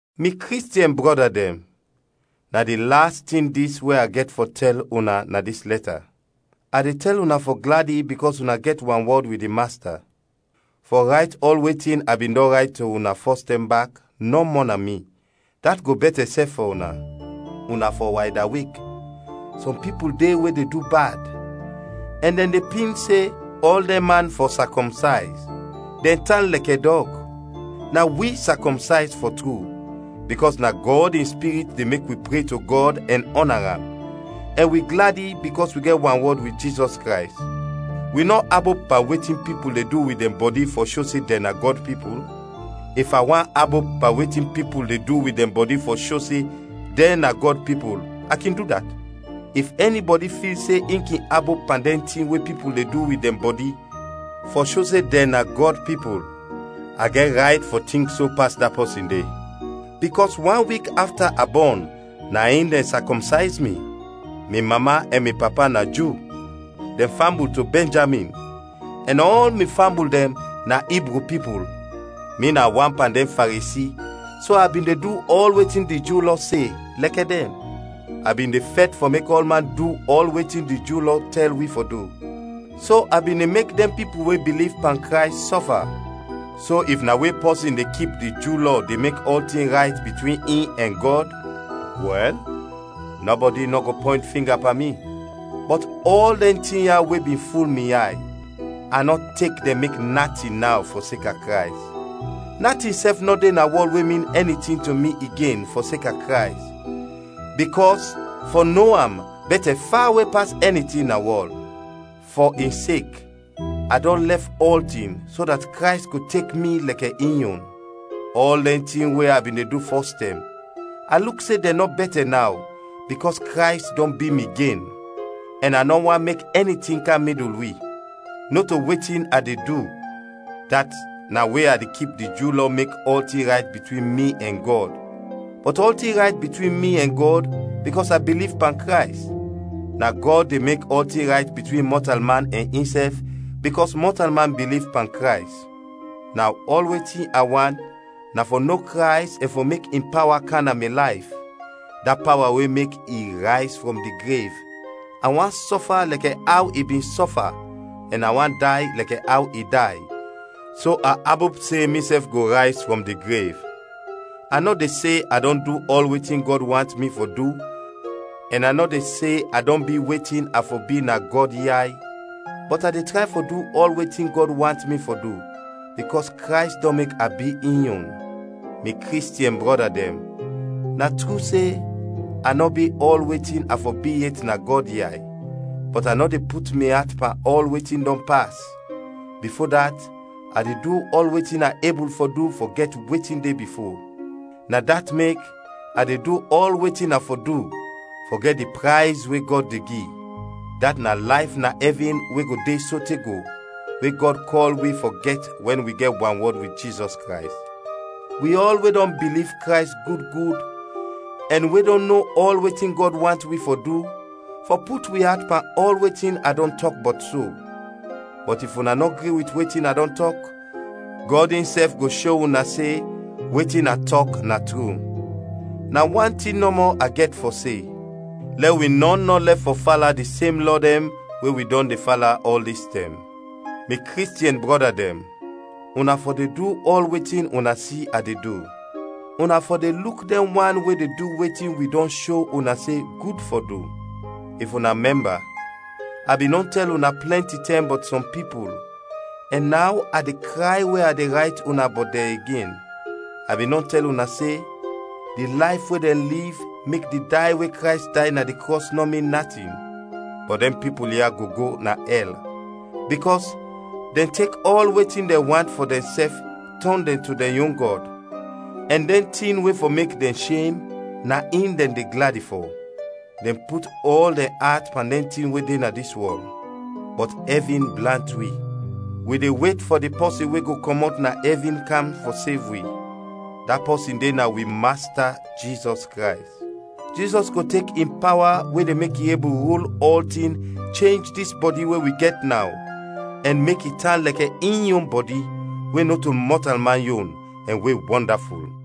Mi Kristiɛn brɔda dɛn, na di las tin dɛn dis we a gɛt fɔ tɛl una na dis lɛta. A de tɛl una fɔ gladi bikɔs una gɛt wanwɔd wit di Masta. Fɔ rayt ɔl wetin a bin dɔn rayt to una fɔstɛm bak, nɔ mɔna mi, dat go bɛtɛ sɛf fɔ una. Una fɔ waydawek, sɔm pipul de we de du bad, ɛn dɛn de pin se ɔl dɛn man fɔ sakɔmsayz; dɛn tan lɛkɛ dɔg. Na wi sakɔmsayz fɔ tru, bikɔs na Gɔd in Spirit de mek wi pre to Gɔd ɛn ɔna Am, ɛn wi gladi bikɔs wi gɛt wanwɔd wit Jizɔs Krays. Wi nɔ abop pan wetin pipul de du wit dɛn bɔdi fɔ sho se dɛn na Gɔd pipul. If a want abop pan wetin pipul de du wit dɛn bɔdi fɔ sho se dɛn na Gɔd pipul, a kin du dat. If ɛnibɔdi fil se in kin abop pan dɛn tin we pipul de du wit dɛn bɔdi fɔ sho se dɛn Gɔd pipul, a gɛt rayt fɔ tink so pas da pɔsin de. Bikɔs wan wik afta a bɔn na in dɛn sakɔmsayz mi. Mi mama ɛn mi papa na Ju, dɛn fambul to Bɛnjamin, ɛn ɔl mi fambul dɛn na Ibru pipul. Mi na wan pan dɛn Faresi so a bin de du ɔl wetin di Ju Lɔ se, lɛkɛ dɛn. A bin de fɛt fɔ mek ɔlman du ɔl wetin di Ju Lɔ tɛl wi fɔ du, so a bin de mek dɛn pipul we biliv pan Krays sɔfa. So if na we pɔsin de kip di Ju Lɔ de mek ɔltin rayt bitwin in ɛn Gɔd, wɛl, nɔbɔdi nɔ go pɔynt finga pan mi. Bɔt ɔl dɛn tin ya we bin ful mi yay, a nɔ tek dɛn mek natin naw fɔseka Krays. Natin sɛf nɔ de na wɔl we min ɛni tin to mi igen fɔseka Krays, bikɔs fɔ no am bɛtɛ fawe pas ɛni tin na wɔl. Fɔ in sek a dɔn lɛf ɔltin so dat Krays go tek mi lɛkɛ in yon. Ɔl dɛn tin we a bin de du fɔstɛm, a luk se dɛn nɔ bɛtɛ naw, bikɔs Krays dɔn bi mi gen; ɛn a nɔ want mek ɛni tin kam midul wi. Nɔto wetin a de du, dat na we a de kip di Ju Lɔ mek ɔltin rayt bitwin mi ɛn Gɔd, bɔt ɔltin rayt bitwin mi ɛn Gɔd bikɔs a biliv pan Krays. Na Gɔd de mek ɔltin rayt bitwin mɔtalman ɛn insɛf bikɔs mɔtalman biliv pan Krays. Naw ɔl wetin a want na fɔ no Krays ɛn fɔ mek in pawa kam na mi layf, da pawa we mek i rayz frɔm di grev, a want sɔfa lɛkɛ aw i bin sɔfa ɛn a want day lɛkɛ aw i day, so a abop se misɛf go rayz frɔm di grev. A nɔ de se a dɔn du ɔl wetin Gɔd want mi fɔ du ɛn a nɔ de se a dɔn bi wetin a fɔ bi na Gɔd yay, bɔt a de tray fɔ du ɔl wetin Gɔd want mi fɔ du, bikɔs Krays dɔn mek a bi in yon. Mi Kristiɛn brɔda dɛn, na tru se, a nɔ bi ɔl wetin a fɔ bi yet na Gɔd yay, bɔt a nɔ de put mi at pan ɔl wetin dɔn pas, bifo dat a de du ɔl wetin a ebul fɔ du fɔ gɛt wetin de bifo. Na dat mek a de du ɔl wetin a fɔ du, fɔ gɛt di prayz we Gɔd de gi; dat na layf na ɛvin we go de sote go we Gɔd kɔl wi fɔ gɛt wɛn wi gɛt wanwɔd wit Jizɔs Krays. Wi ɔl we dɔn biliv Krays gud gud ɛn we dɔn no ɔl wetin Gɔd want wi fɔ du, fɔ put wi at pan ɔl wetin a dɔn tɔk bɔt so, bɔt if una nɔ gri wit wetin a dɔn tɔk, Gɔd insɛf go sho una se wetin a tɔk na tru. Na wan tin nɔmɔ a gɛt fɔ se, lɛ wi nɔn nɔ lɛf fɔ fala di sem lɔ dɛn we wi dɔn de fala ɔl dis tɛm. Mi Kristiɛn brɔda dɛn, una fɔ de du ɔl wetin una si a de du. Una fɔ de luk dɛn wan we de du wetin wi dɔn sho una se gud fɔ du. If una mɛmba, a bin dɔn tɛl una plɛnti tɛm bɔt sɔm pipul, ɛn naw a de kray we a de rayt una bɔt dɛn igen. A bin dɔn tɛl una se: di layf we dɛn liv mek di day we Krays day na di krɔs nɔ min natin. Bɔt dɛn pipul ya go go na ɛl, bikɔs dɛn tek ɔl wetin dɛn want fɔ dɛnsɛf tɔn dɛn to dɛn yon gɔd; ɛn dɛn tin we fɔ mek dɛn shem, na in dɛn de gladi fɔ. Dɛn put ɔl dɛn at pan dɛn tin we de na dis wɔl. Bɔt ɛvin blant wi. Wi de wet fɔ di pɔsin we go kɔmɔt na ɛvin kam fɔ sev wi, da pɔsin de na wi Masta Jizɔs Krays. Jizɔs go tek in pawa we de mek i ebul rul ɔltin chenj dis bɔdi we wi gɛt naw, ɛn mek i tan lɛkɛ in yon bɔdi, we nɔto mɔtalman yon ɛn we wɔndaful.